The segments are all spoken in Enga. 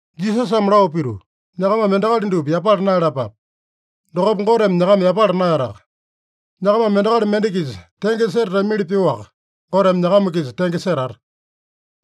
Jisasame lao pituu, “Nyakamame endakali dupa yapala naeyalapape. Dokopa Goteme nyakama yapala naeyataka. Nyakamame endakali mende-kisa tenge setatamili pyoaka, Goteme nyakama-kisa tenge setata.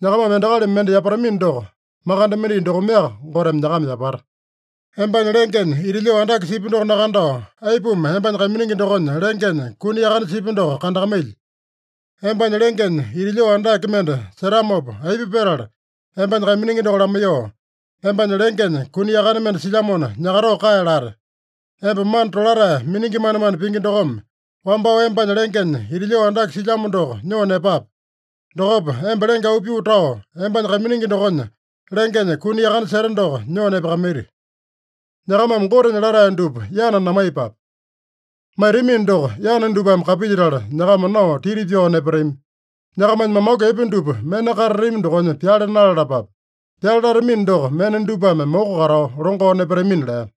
Nyakamame endakali mende yapatamino doko, makande mendai dokomeaka Goteme nyakama yapata. Embanya lengenya ita lyoo andake sipya doko nakandao, aipuma embanya kaiminingi dokonya lengenya kuni yakane sipya doko kandakamailyi? Embanya lengenya ita lyoo andake mende setamopa, aipa petala embanya kaiminingi doko lamaiyoo, ‘Embanya lengenya kuni yakane mende silyamona, nyakatoo kae’ late? Emba mana tolatae miningi manemane pingi dokome, wambao embanya lengenya ita lyoo andake silyamo doko nyoo nepape. Dokopa emba lenge auu pyoo tao, embanya kaiminingi dokonya lengenya kuni yakane seta doko nyoo nepakamaiti. “Nyakamame Gotenya latae dupa yana namaiyepape. Maitamino doko, yana dupame kapilyetala nyakama nao titi pyao nepatami. Nyakamanya mamaku epe dupa mena katatami dokonya pyale nalalapape. Pyale latamino doko, mena dupame moko katao longao nepatamina” lea.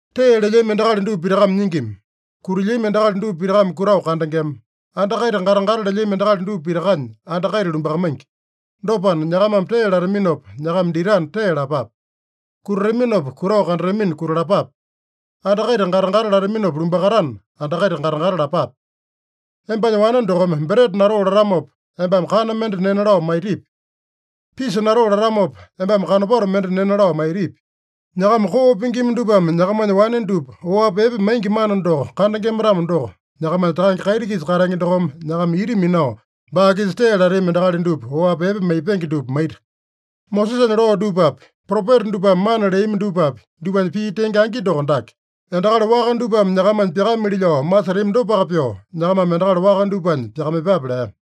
“Tee lelyami endakali dupa pitakame nyingima. Kutilyami endakali dupa pitakame kutao kandengema. Anda kaita gata-gata lelyami endakali dupa pitakanya anda kaita lumbakamaingi. Dopana, nyakamame tee lataminopa nyakama ditana, tee lapape. Kutataminopa kutao kandatamina, kutalapape. Anda kaita gata-gata lataminopa lumbakatana, anda kaita gata-gata lapape. Embanya wane dokome breta natoo latamopa, embame kana mende nena lao maitipi? Pisa natoo latamopa, embame kanopato mende nena lao maitipi? Nyakama koo pingima dupame nyakamanya wane dupa oapi epe maingi mana doko kandengema-tamo doko, nyakamanya Takange kaiti-kisa katenge dokome nyakama ita minao, baa-kisa tee latami endakali dupa oapi epe maipenge dupa maita. “Mosesanya loo dupapi, propeta dupame mana leami dupapi, dupanya pii tenge angi doko dake: Endakali waka dupame nyakamanya pyakamili lao masetami dopaka pyoo, nyakamame endakali waka dupanya pyakamaiyepape” lea.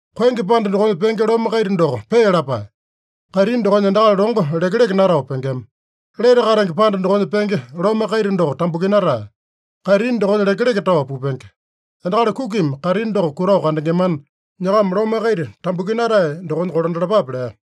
“Koenge panda dokonya penge lome kaita doko pee lapae. Kaitini dokonya endakali longo lekeleke natao pengema. Lete katenge panda dokonya penge lome kaita doko tambukinatae. Kaitini dokonya lekeleke tao pupenge. Endakali kukimi kaitini doko kutao kandengemana, nyakama lome kaita tambukinatae dokonya kolandalapape” lea.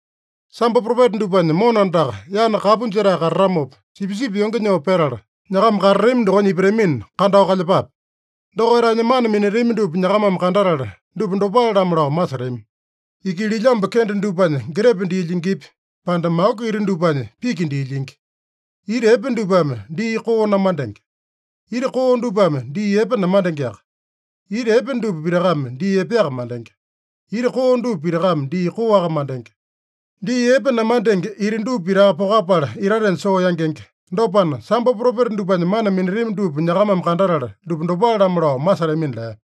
“Sambo propeta dupanya mona andaka yana kapu jetae katatamopa, sipisipi yonge nyoo petala, nyakama katatami dokonya ipatamina, kandao kalyepape. Dokaitanya mana minatami dupa nyakamame kandatala, dupa dopale-lamo lao masetami. Ikililyambu kende dupanya getepe dii lyingipi, pande maku ita dupanya piki dii lyingi? Ita epe dupame dii koo namandenge. Ita koo dupame dii epe namandengeaka. Ita epe dupa pitakame dii epeaka mandenge. Ita koo dupa pitakame dii koaka mandenge. Dii epe namandenge ita dupa pitaka pokapala, itatenya soo yangenge. Dopana, sambo propeta dupanya mana minatami dupa nyakamame kandatala, dupa dopale-lamo lao masetamina” lea.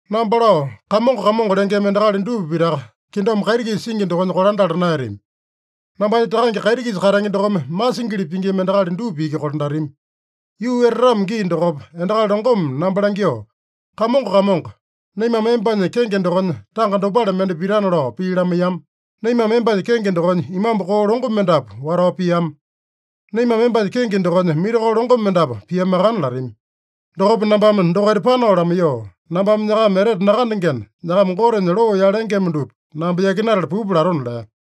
“Namba lao, ‘Kamongo, Kamongo’ lengema endakali dupa pitaka kingdom kaiti-kisa singi dokonya kolandala naeyatami. Nambanya Takange kaiti-kisa katenge dokome masingili pingima endakali dupa iki kolandatami. Yuu etatamo gii dokopa, endakali longome namba langyoo, ‘Kamongo, Kamongo, naimame embanya kenge dokonya tanga dopale mende pitana lao pii lamaiyama. Naimame embanya kenge dokonya imambu koo longo mendapu watao piama. Naimame embanya kenge dokonya mirakolo longo mendapu piamakana’ latami. Dokopa nambame dokaita panao lamaiyoo, ‘Nambame nyakama etete nakandengena, nyakama Gotenya loo yalengema dupa namba yakinatala pupa’ latona” lea.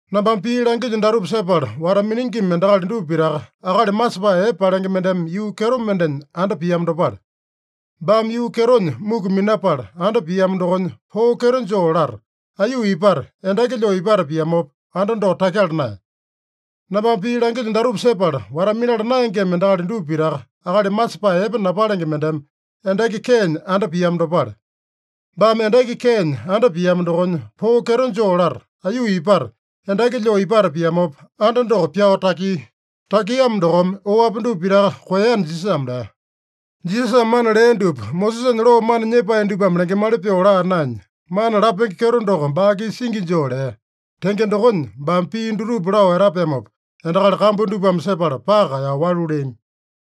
“Nambame pii langilyo datupa sepala wata-miningima endakali dupa pitaka, akali masepae epe palenge mendeme yuu kyeto mendenya anda piamo dopale. Baame yuu kyetonya muku minapala anda piamo dokonya, poo kyeto joo lata, aiyuu ipata, endaki lyoo ipata piamopa, anda doko takyala naeya. Nambame pii langilyo datupa sepala wata-minala naengema endakali dupa pitaka, akali masepae epe napalenge mendeme endaki keenya anda piamo dopale. Baame endaki keenya anda piamo dokonya, poo kyeto joo lata, aiyuu ipata, endaki lyoo ipata piamopa, anda doko pyao takia. Takiamo dokome, oapi dupa pitaka koeyana” Jisasame lea. Jisasame mana lea dupa, Mosesanya loo mana nyepae dupame lengemali pyoo laa naenya, mana lapenge kyeto doko baa-kisa singi joo lea. Tenge dokonya, baame pii dutupa lao etapeamopa, endakali kambu dupame sepala paka kaeyao walu leami.